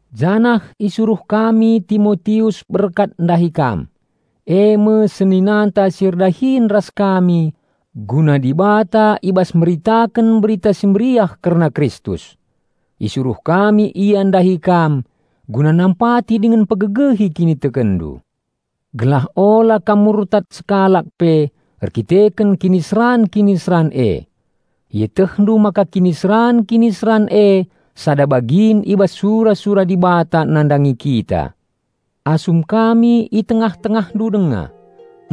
janah isuruh kami Timotius berkat ndahi kam, e me seninanta si erdahin ras kami guna Dibata i bas meritaken Berita Si Meriah kerna Kristus. Isuruh kami ia ndahi kam guna nampati dingen mpegegehi kinitekenndu, gelah ula kam murtad sekalak pe erdandanken kiniseran-kiniseran e. Ietehndu maka kiniseran-kiniseran e sada bagin i bas sura-sura Dibata nandangi kita. Asum kami i tengah-tengahndu denga,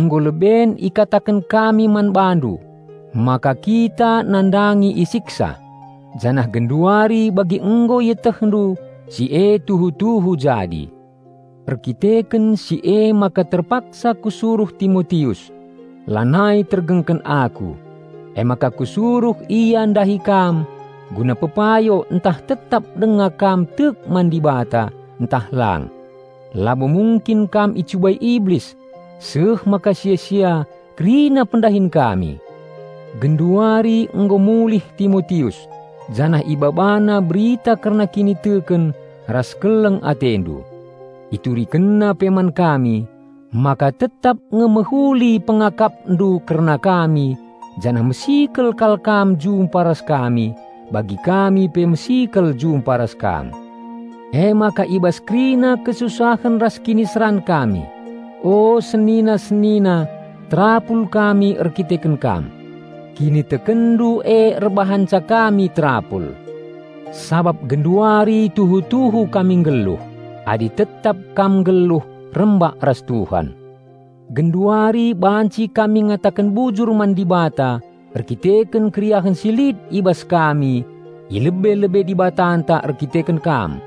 nggo leben ikataken kami man bandu maka kita nandangi isiksa; janah genduari bagi nggo ietehndu si e tuhu-tuhu jadi. Erdandanken si emaka terpaksa kusuruh Timotius. Lanai tergengken aku, emaka kusuruh ia ndahi kam guna pepayo ntah tetap denga kam tek man Dibata ntah lang. Labo mungkin kam icubai Iblis seh maka sia-sia kerina pendahin kami! Genduari nggo mulih Timotius, janah ibabana berita kerna kiniteken ras keleng atendu. Iturikenna pe man kami, maka tetap nge mehuli pengakapndu kerna kami janah mesikel kal kam jumpa ras kami bagi kami pe mesikel jumpa ras kam. Emaka i bas kerina kesusahen ras kiniseran kami, o senina-senina terapul kami erdandanken kam. Kinitekenndu e erbahanca kami terapul. Sabap genduari tuhu-tuhu kami nggeluh, adi tetap kam nggeluh rembak ras Tuhan. Genduari banci kami ngataken bujur man Dibata erkiteken keriahen si lit i bas kami i lebe-lebe Dibatanta erdandanken kam.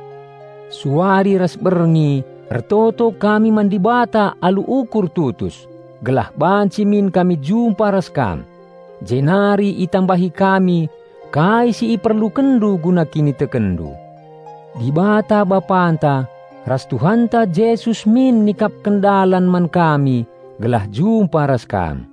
Suari ras berngi ertoto kami man Dibata alu ukur tutus, gelah banci min kami jumpa ras kam, jenari itambahi kami kai si iperlukenndu guna kinitekenndu. Dibata Bapanta, ras Tuhanta Jesus min nikapken dalan man kami gelah jumpa ras kam.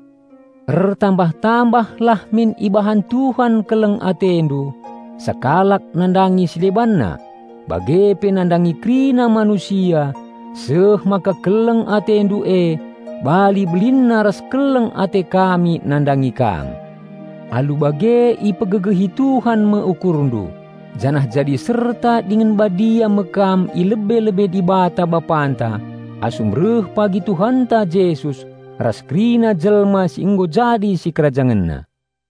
Ertambah-tambalah min ibahan Tuhan keleng atendu sekalak nandangi si debanna bage pe nandangi kerina manusia seh maka keleng atendu e bali belinna ras keleng ate kami nandangi kam. Alu bage ipegegehi Tuhan me ukurndu, janah jadi serta dingen badia me kam i lebe-lebe Dibata Bapanta asum reh pagi Tuhanta Jesus ras kerina jelma si nggo jadi sikerajangenna.